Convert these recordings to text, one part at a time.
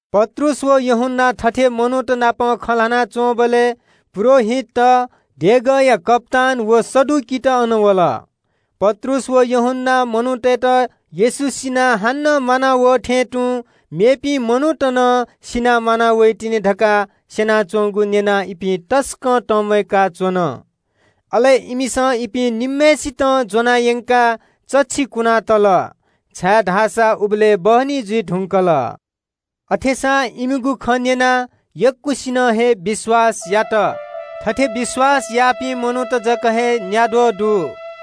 पत्रुस व यूहन्‍ना थथे मनूत नाप खँ ल्‍हाना च्‍वंबलय् पुजाहारीत, देगःया कप्‍तान व सदुकीत अन वल। पत्रुस व यूहन्‍नां मनूतय्‌त येशू सिनाः हानं म्‍वाना वः थें तुं मेपिं मनूत नं सिनाः म्‍वाना वइतिनि धकाः स्‍यनाच्‍वंगु न्‍यनाः इपिं तसकं तंम्‍वय्‌का च्‍वन। अले इमिसं इपिं निम्‍हय्‌सितं ज्‍वनायंकाः चच्‍छि कुनातल, छाय्‌धाःसा उबलय् बहनी जुइ धुंकल। अथेसां इमिगु खँ न्‍यनाः यक्‍वसिनं हे विश्‍वास यात। थथे विश्‍वास याःपिं मिजंत जक हे न्‍याद्वः ति दत।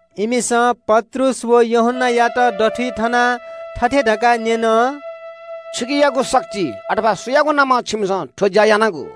इमिसं पत्रुस व यूहन्‍नायात दथुइ थनाः थथे धकाः न्‍यन – “छुकियागु शक्तिं, अथवा सुयागु नामं छिमिसं थ्‍व ज्‍या यानागु?”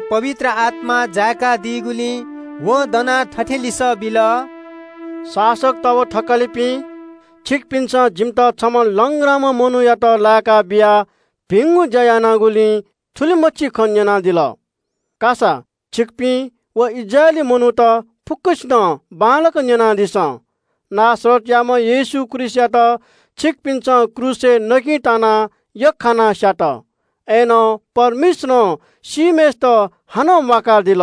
पवित्र आत्‍मां जायाः पत्रुसं दनाः थथे लिसः बिल – “शासकत व थकालिपिं, छिकपिन्‍सं जिमित छम्‍ह लंग्राम्‍ह मनूयात लाय्‌का बियाः भिंगु ज्‍या यानागुलिं थुलिमछि खँ न्‍यनादिल। का सा, छिकपिं व इस्राएली मनूत फुक्‍कसिनं बांलाक न्‍यनादिसँ – नासरतयाम्‍ह येशू ख्रीष्‍टयात छिकपिन्‍सं क्रूसय् यख्‍खानाः स्‍यात, अय्‌नं परमेश्‍वरं सीम्‍हय्‌सित हानं म्‍वाकादिल।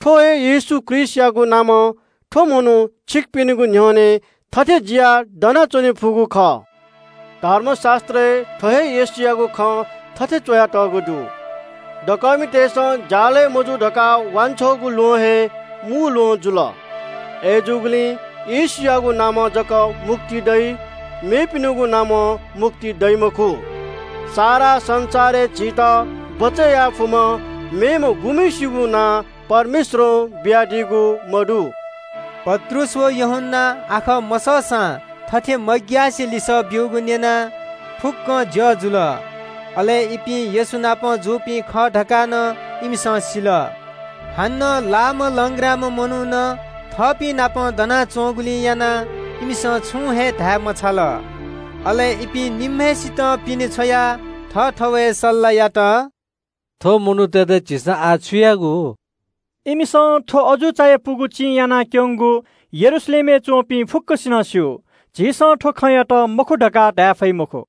थ्‍व हे येशू ख्रीष्‍टयागु नामं थ्‍व मनू छिकपिनिगु न्‍ह्यःने थथे लनाः दनाच्‍वने फुगु खः। धर्मशास्‍त्रय् थ्‍व हे येशूयागु खँ थथे च्‍वयातःगु दु – “‘दकःमितय्‌सं ज्‍यालगय् मजू धकाः वांछ्वःगु ल्‍वहं हे मू ल्‍वहं जुल।’ “अय्‌जूगुलिं येशूयागु नामं जक मुक्ति दइ, मेपिनिगु नामं मुक्ति दइ मखु। सारा संसारय् झीत बचय् याये फुम्‍ह मेम्‍हय्‌सिगु नां परमेश्‍वरं बियादीगु मदु।” पत्रुस व यूहन्‍नां आखः मसःसां थथे मग्‍यासे लिसः ब्‍यूगु न्‍यनाः फुक्‍कं छक्‍क जुल। अले इपिं येशू नाप जूपिं खः धकाः नं इमिसं सिल। हानं लाःम्‍ह लंग्राम्‍ह मनू नं थःपिंनापं दनाच्‍वंगुलिं इमिसं छुं हे धाये मफुत। अले इपिं निम्‍हय्‌सितं पिने छ्वयाः थःथवय् सल्‍लाह यात – “थ्‍व मनूतय्‌त झीसं आः छु यायेगु? इमिसं थ्‍व अजू चायापुगु चिं यानाक्‍यंगु यरूशलेमय् च्‍वंपिं फुक्‍कसिनं स्‍यू। झीसं थ्‍व खँयात मखु धकाः धाये फइ मखु।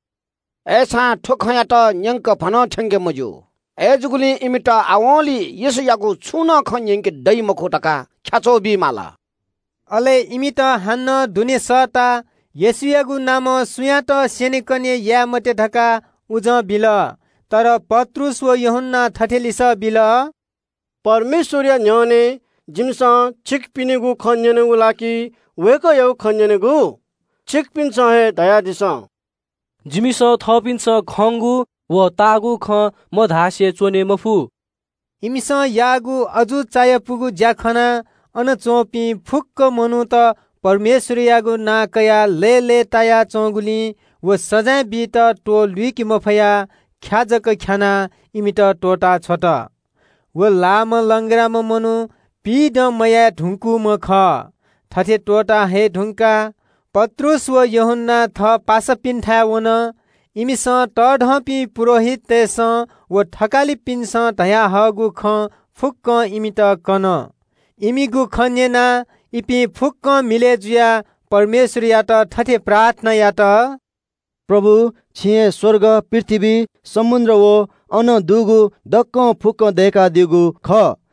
अय्‌सां थ्‍व खँयात न्‍यंकभनं थ्‍यंके मज्‍यू। अय्‌जूगुलिं इमित आवंलि येशूयागु छुं नं खँ न्‍यंके दइ मखु धकाः ख्‍याच्‍वः बी माल।” अले इमित हानं दुने सःताः येशूयागु नामं सुयातं स्‍यनेकने याये मते धकाः उजं बिल। अय्‌नं पत्रुस व यूहन्‍नां थथे लिसः बिल – “परमेश्‍वरया न्‍ह्यःने जिमिसं छिकपिनिगु खँ न्‍यनेगु ला कि वय्‌कःयागु खँ न्‍यनेगु? छिकपिन्‍सं हे धयादिसँ। जिमिसं थःपिन्‍सं खंगु व ताःगु खँ मधासे च्‍वने मफु।” इमिसं याःगु अजू चायापुगु ज्‍या खनाः अन च्‍वंपिं फुक्‍क मनूत परमेश्‍वरयागु नां कयाः लय्‌लय् ताया च्‍वंगुलिं व सजाँय बीत त्‍वहः लुइके मफयाः ख्‍या जक ख्‍यानाः इमित त्‍वःता छ्वल। व लाःम्‍ह लंग्राम्‍ह मनू पिइदँ मयाये धुंकूम्‍ह खः। थथे त्‍वःता हये धुंकाः पत्रुस व यूहन्‍ना थः पासापिन्‍थाय् वन। इमिसं तःधंपिं पुजाहारीतय्‌सं व थकालिपिन्‍सं धयाहःगु खँ फुक्‍कं इमित कन। इमिगु खँ न्‍यनाः इपिं फुक्‍कं मिलय् जुयाः परमेश्‍वरयात थथे प्रार्थना यात – “प्रभु, छिं हे स्‍वर्ग, पृथ्‍वी, समुद्र व अन दुगु दक्‍व फुक्‍कं दय्‌कादीगु खः।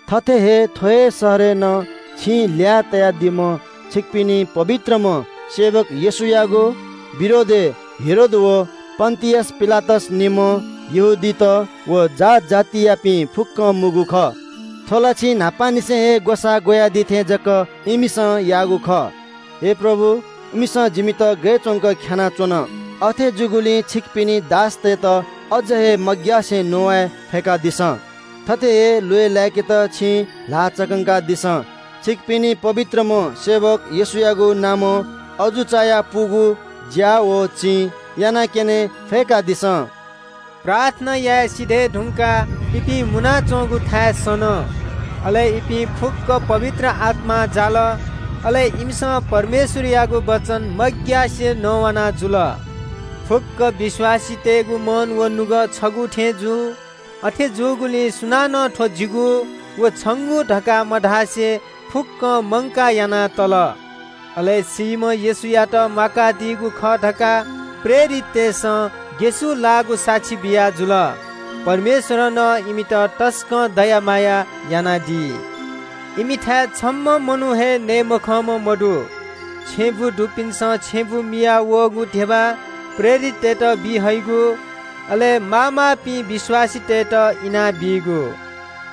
“थथे हे थ्‍व हे शहरय् नं छिं ल्‍यया तयादीम्‍ह छिकपिनि पवित्रम्‍ह सेवक येशूयागु विरोधय् हेरोद व पन्‍तियस पिलातस नं, यहूदीत व यहूदीमखुपिंनापं मुंगु खः। थ्‍व ला छिं न्‍हापांनिसें हे ग्‍वसाः ग्‍वयादी थें जक इमिसं याःगु खः। आः ला प्रभु, इमिसं जिमित गय् च्‍वंक ख्‍यानाच्‍वन। अथे जूगुलिं छिकपिनि दासतय्‌त अझ हे मग्‍यासे नवाये फय्‌कादिसँ। थथे हे ल्‍वय् लाय्‌केत छिं ल्‍हाः चकंकादिसँ। छिकपिनि पवित्रम्‍ह सेवक येशूयागु नामं अजू चायापुगु ज्‍या व चिं यानाक्‍यने फय्‌कादिसँ।” प्रार्थना याये सिधये धुंकाः इपिं मुनाच्‍वंगु थाय् सन। अले इपिं फुक्‍कं पवित्र आत्‍मां जाल। अले इमिसं परमेश्‍वरयागु वचन मग्‍यासे नवाना जुल। फुक्‍क विश्‍वासीतय्‌गु मन व नुगः छगू थें जू। अथे जूगुलिं सुनानं थ्‍व जिगु व छंगु धकाः मधासे फुक्‍कं मंकाः याना तल। अले सीम्‍ह येशूयात म्‍वाकादीगु खः धकाः प्रेरिततय्‌सं ग्‍यसुलाःगु साक्षी बियाजुल। परमेश्‍वरं नं इमित तसकं दया माया यानादी। इमिथाय् छम्‍ह मनू हे नये मखंम्‍ह मदु। छेँबुँ दुपिन्‍सं छेँबुँ मियाः वःगु धिबा प्रेरिततय्‌त बी हइगु, अले माःमाःपिं विश्‍वासीतय्‌त इनाबीगु।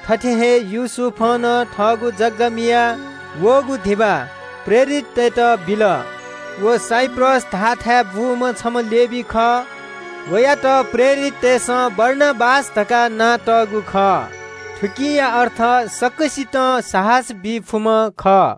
थथे हे योसेफं नं थःगु जग्‍गा मियाः वःगु धिबा प्रेरिततय्‌त बिल। व साइप्रस धाःथाय् बूम्‍ह छम्‍ह लेवी खः। वयात प्रेरिततय्‌सं बारनाबास धकाः नां तःगु खः। थुकिया अर्थ “सकसितं साहस बी फुम्‍ह” खः।